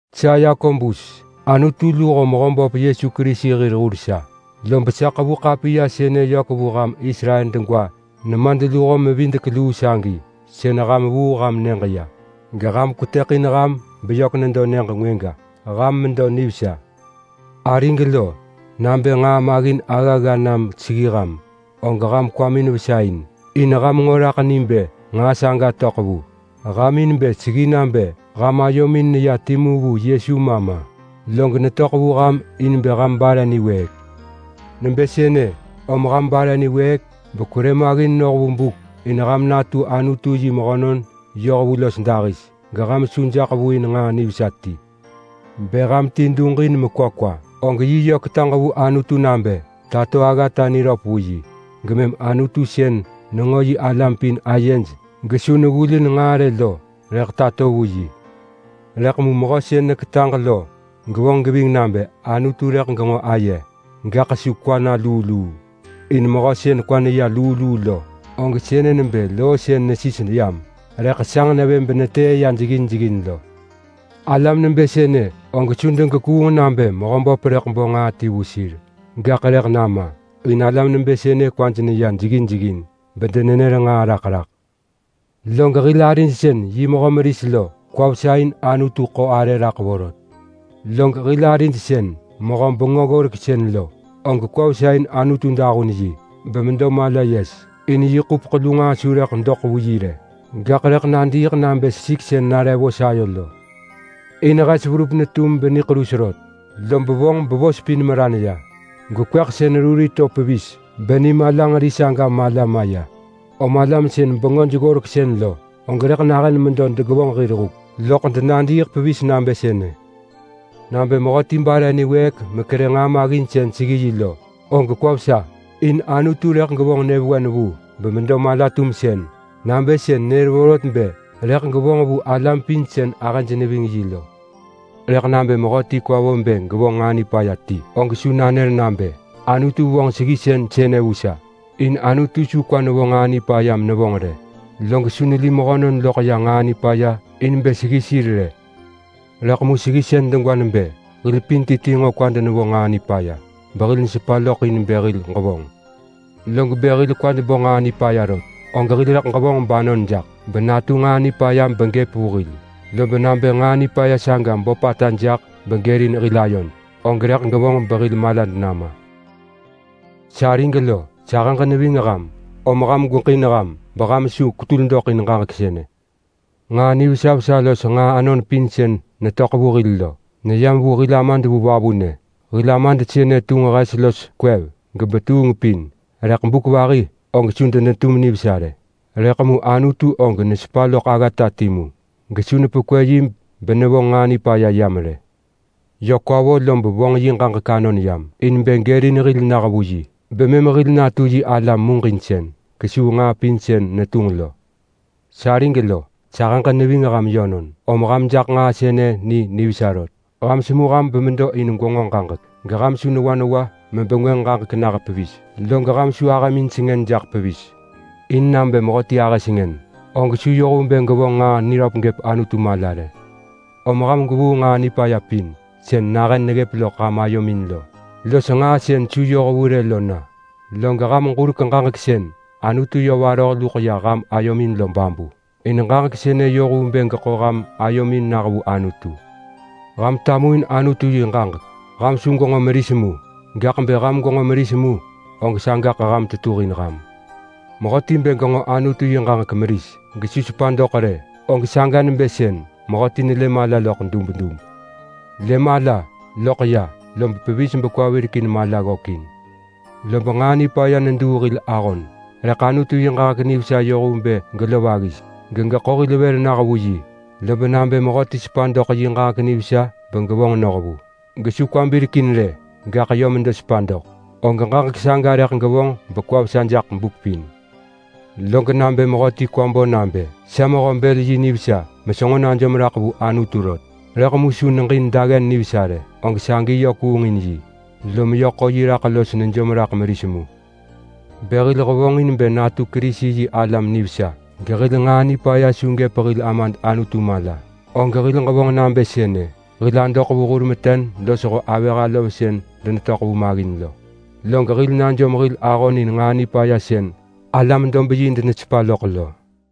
Sa Yakobus, Anutu luho Mehöböp Yesu Kerisi hir hur sa, lob sa ḳevu ḳapiya sënë yök vu ham Israel degwa nemadluho-mevidek-luu sagi, sën ham vuu ham nyëġ ya geham kwetëḳin ham beyök nedo nyëġ ngwëga. Ham medo nivesa. Arig lo, nabë nġaa maggin aggagga nam seggi ham, og ham kwamin vesa in. In ham nġo raḳ ni bë nġaa saga töḳ vu ham in bë seggi nabë ham ayomin neya timu vu Yesu ma ma. Log netöḳ vu ham in bë ham bare niwëëk. Nebë sënë, om ham bare niwëëk bekwerë maggin noh vu buk in ham natu Anutu yi mehönon yohvu los dahis, geham su jaḳ vu in nġaa nivesa ti. Bë ham ti duġin mekwa kwa, og yi yö ketaġ vu Anutu nabë tato aggata niröp vu yi, gemëm Anutu sën nenġo yi alam pin ayej gesu neggulin nġaa rë lo rëḳ tato vu yi. Rëḳ mu mehö sën neketaġ lo gevonġ geving nabë Anutu rëḳ genġo aye, gaḳ su kwa na luu luu. In mehö sën kwa neya luu luu lo, og sënë nebë loo sën nesis yam rëḳ sanġ nevë benetëë ya jeggin jeggin lo. Alam nebë sënë og su degekuung nabë Mehöböp rëḳ bo nġaa ti vu sir. Gaḳ rëḳ nama, in alam nebë sënë kwaj neya jeggin jeggin bedenenër nġaa raḳ raḳ. Log hil arid sën yi mehö meris lo, kwa vesa in Anutu ḳo arë raḳ vorot. Log hil arid sën mehö bengö-ggoreksën lo, og kwa vesa in Anutu dahun yi, bemedo mala yes. In yi ḳupeḳ lu nġaa su rëḳ doḳ vu yi rë, gaḳ rëḳ nadiiḳ nabë sesik sën nare vos ayo lo. In hes verup netum beniḳerus rot, lob vonġ bevos pin meran ya gesesik rurin to pevis beni malanġeri saga mala maya. Om alam sën bengöj-ggoreksën lo og rëḳ nahën medo degevonġ hir huk loḳ denadiiḳ pevis nabë sënë. Nabë mehöti bare niwëëk mekerë nġaa maggin sën seggi yi lo, og kwa vesa. In Anutu rëḳ gevonġ nyëvewen vu bemedo mala-tumsën nabë sën nër vorot bë rëḳ gevonġ vu alam pin sën ahëj neving yi lo. Rëḳ nabë mehöti kwa vo bë gevonġ nġaa nipaya ti, og su nanër nabë, “Anutu vonġ seggisën sënë vu sa!” In Anutu su kwa nevo nġaa nipaya menevonġ rë, log su neli mehönon loḳ ya nġaa nipaya in bë seggi sir rë. Rëḳ mu seggisën degwa nebë hil pin ti ti nġo kwad nevo nġaa nipaya behil nesepa loḳ in bë hil ġevonġ. Log bë hil kwad bo nġaa nipaya rot, og hil rëḳ ġevonġ banon jaḳ benatu nġaa nipaya begëp vu hil. Lob nabë nġaa nipaya saga böpata jaḳ begërin hil ayod, og rëḳ gevonġ behil malad nama. Sarig lo, sahëġ neving ham om ham gweġin ham, beham su kwetul doḳ in ġaġek sënë. Nġaa nivesa vesa los nġaa anon pin sën netöḳ vu hil lo neyam vu hil Amad vu vavunë. Hil Amad sënë tunġ hes los kwev gebetuheng pin, rëḳ buk vahi og su denetum nivesa rë. Rëḳ mu Anutu og nesepa loḳ aggata timu gesu nepekwë yi benevonġ nġaa nipaya yam rë. Yö kwa vo lob vonġ yi ġaġek anon yam in bë gërin hil nah vu yi bemëm hil natu yi alam muġinsën kesuu nġaa pin sën netunġ lo. Sarig lo, sahëġ neving ham yönon, om ham jaḳ nġaa sënë ni nivesa rot. Ham semu ham pevis in gwenġo ġaġek, rëḳ mu ham su newa newa megwevonġ ġaġek. Log ham su ahëmin sengën jaḳ pevis. In nabë mehöti ahë sengën, og su yoh vu bë gevonġ nġaa niröp gëp Anutu mala rë. Om ham gwevuu nġaa nipaya pin sën nahën neggëp loḳ ham ayomin lo los nġaa sën su yohvu rë lo na. Log ham ġurek ġaġek sën Anutu yö varoh luḳ ya ham ayomin lo babu, in ġaġek sënë yoh vu bë geḳo ham anomin nah vu Anutu. Ham tamuin Anutu yi ġaġek. Ham su gwenġo meris mu, gaḳ bë ham gwenġo meris mu, og sagaḳ ham tetuhin ham. Mehöti bë genġo Anutu yi ġaġek meris gesu sepa doḳ rë, og saga nebë sën mehöti nelë mala loḳ dubdub. Lë mala, loḳ ya, lob pevis bekwa virekin mala ggökin. Lob nġaa nipaya neduu hil ahon, rëḳ Anutu yi ġaġek nivesa yoh vu bë gelov aggis gegeḳo hil vër nah vu yi. Lob nabë mehöti sepa doḳ yi ġaġek nivesa begevonġ noh vu, log su genġo gekwa birekin rë, gaḳ yö medo sepa doḳ, og ġaġek saga rëḳ gevonġ bekwa vesa jaḳ buk pin. Log nabë mehöti kwa bo nabë, “Sa mehö-bël-yi nivesa mesenġo najom raḳ vu Anutu rot!” rëḳ mu su neġin daggen nivesa rë, og sagi yö kuungin yi, lom yö ḳo yi raḳ los nejom raḳ meris mu. Bë hil hevonġin bë natu Kerisi-yi-alam nivesa gehil nġaa nipaya su gëp hil Amad Anutu mala rë, og hil ġevonġ nabë sënë: Hil adoḳ vu hur meten losho avëh alov sën denetöḳ vu maggin lo, log hil najom hil ahon in nġaa nipaya sën alam-dob-yi denesepa loḳ lo.